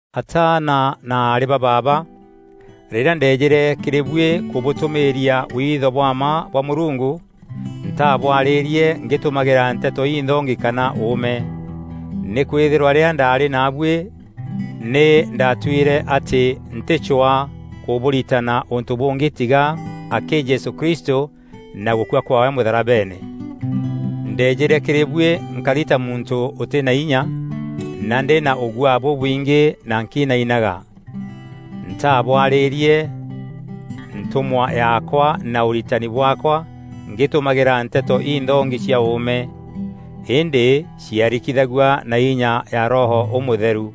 Ataana na aarî ba baaba, rîrîa ndeejîre kîrî buî kûbûtûmîîria witho bwa mma bwa Mûrungu, ntabwarîrie ngîtumagîra nteto inthongi kana ûûme. Nîkwîthîrwa rîrîa ndaarî naabuî nî ndaatuîre atî ntîcwaa kûbûritana ûntû bûngî tiga akî Jesû Kristû na gûkua kwaawe mûtharabeene. Ndeejîre kîrî buî nkari ta muntû ûtî na inya na ndî na ûgûaa bûbwingî na nkinainaga. Ntaabwarîîrie ntûmwa yaakwa na ûritani bwaakwa ngîtumagîra nteto înthongi cia ûûme, îndî ciarikithagua na inya ya Roho Ûmûtheru,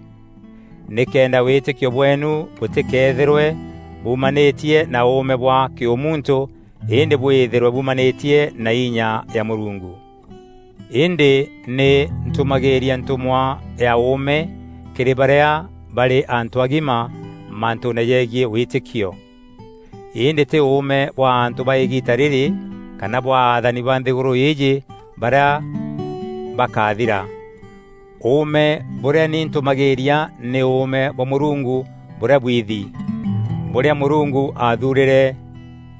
nîkenda wîtîkio bweenu bûtîkeethîrwe bumanîtie na ûûme bwa kîûmuntû îndî bwîthîrwe bumanîtie na inya ya Mûrungu. Îndî nî ntumagîîria ntûmwa ya ûûme kîrî barîa barî antû agima maantûne jegiî wîtîkio. Îndî tî ûûme bwa antû ba îgiita rîrî kana bwa athani ba nthîgûrû îîjî barîa bakathira. Ûûme bûrîa ni ntûmagîîria nî ûûme bwa Mûrungu bûrîa bwithi. Bûrîa Mûrungu athuurîre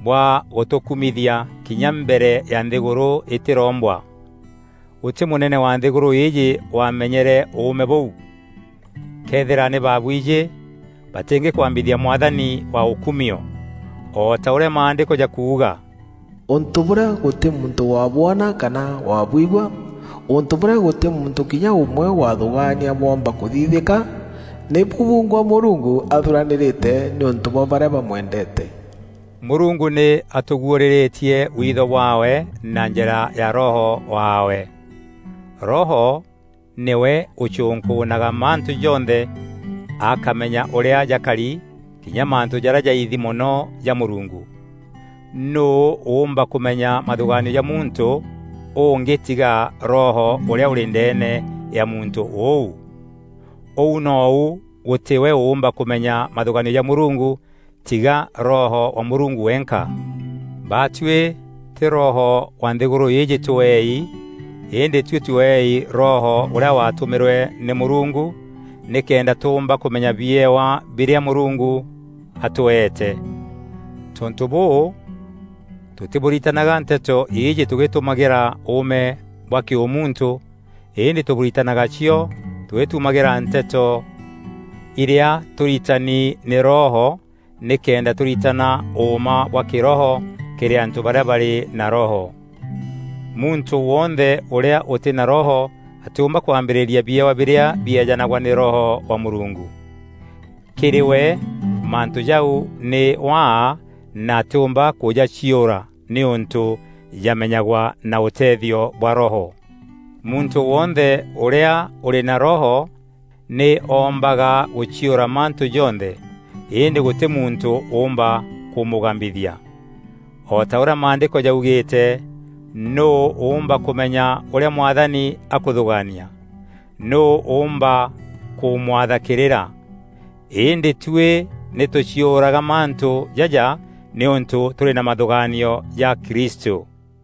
bwa gûtûkumithia kinya mbere ya nthîgûrû îtîrombwa. Gûtî mûnene wa nthîgûrû îîjî waamenyere ûûme bûu. Këethîra nî baabwijî, batîngîkwambithia Mwathani wa ûkumio. O ta ûrîa Maandîko jakuuga, “Ûntû bûrîa gûtî muntû wabwona kana wabwigua, ûntû bûrîa gûtî muntû kinya ûmwe wathûgaania bwoomba kûthithîka, nî bu bungwa Mûrungu athuranîrîte, nîûntû bwa barîa bamwendeete.” Mûrungu nî atûguûrîrîtie witho bwaawe na njîra ya Roho waawe. Roho nîwe ûcûnkûûnaga mantû jonthe akamenya ûrîa jakari, kinya mantû jarîa jaithi mono ja Mûrungu. Nûû ûûmba kûmenya mathûgaanio ja muntû ungî tiga roho ûrîa ûrî ndeene ya muntû ûu? Ûu nou gûtî we ûûmba kûmenya mathûgaanio ja Mûrungu tiga Roho wa Mûrungu wenka. Baatuî tî roho wa nthîgûrû îîjî tweei, îndî tuî tweei Roho ûrîa watûmîrwe nî Mûrungu, nîkenda tûmba kûmenya biewa birîa Mûrungu atweete. Tontû bûû, tûtîbûritanaga nteto îîjî tûgîtumagîra ûûme bwa kîûmuntû îndî tûbûritanaga cio tûgîtumagîra nteto irîa tûritani nî Roho nîkenda tûritana ûûma bwa kîroho kîrî antû barîa barî na Roho. Muntû wonthe ûrîa ûtî na Roho atîûmba kwambîrîria biewa birîa bieejanagwa nî Roho wa Mûrungu. Kîrî we mantû jau nî waa na atîûmba kûjaciûra nîûntû jamenyagwa na ûtethio bwa Roho. Muntû wonthe ûrîa ûrî na Roho nî oombaga gûciûra mantû jonthe, îndî gûtî muntû ûûmba kûmûgambithia. O ta ûrîa Maandîko jaugîîte, “Nûû ûûmba kûmenya ûrîa Mwathani akûthûgaania? Nûû ûûmba kûmwatha kîrîra?” Îndî tuî nî tûciûraga mantû jaja nîûntû tûrî na mathûgaanio ja Kristû.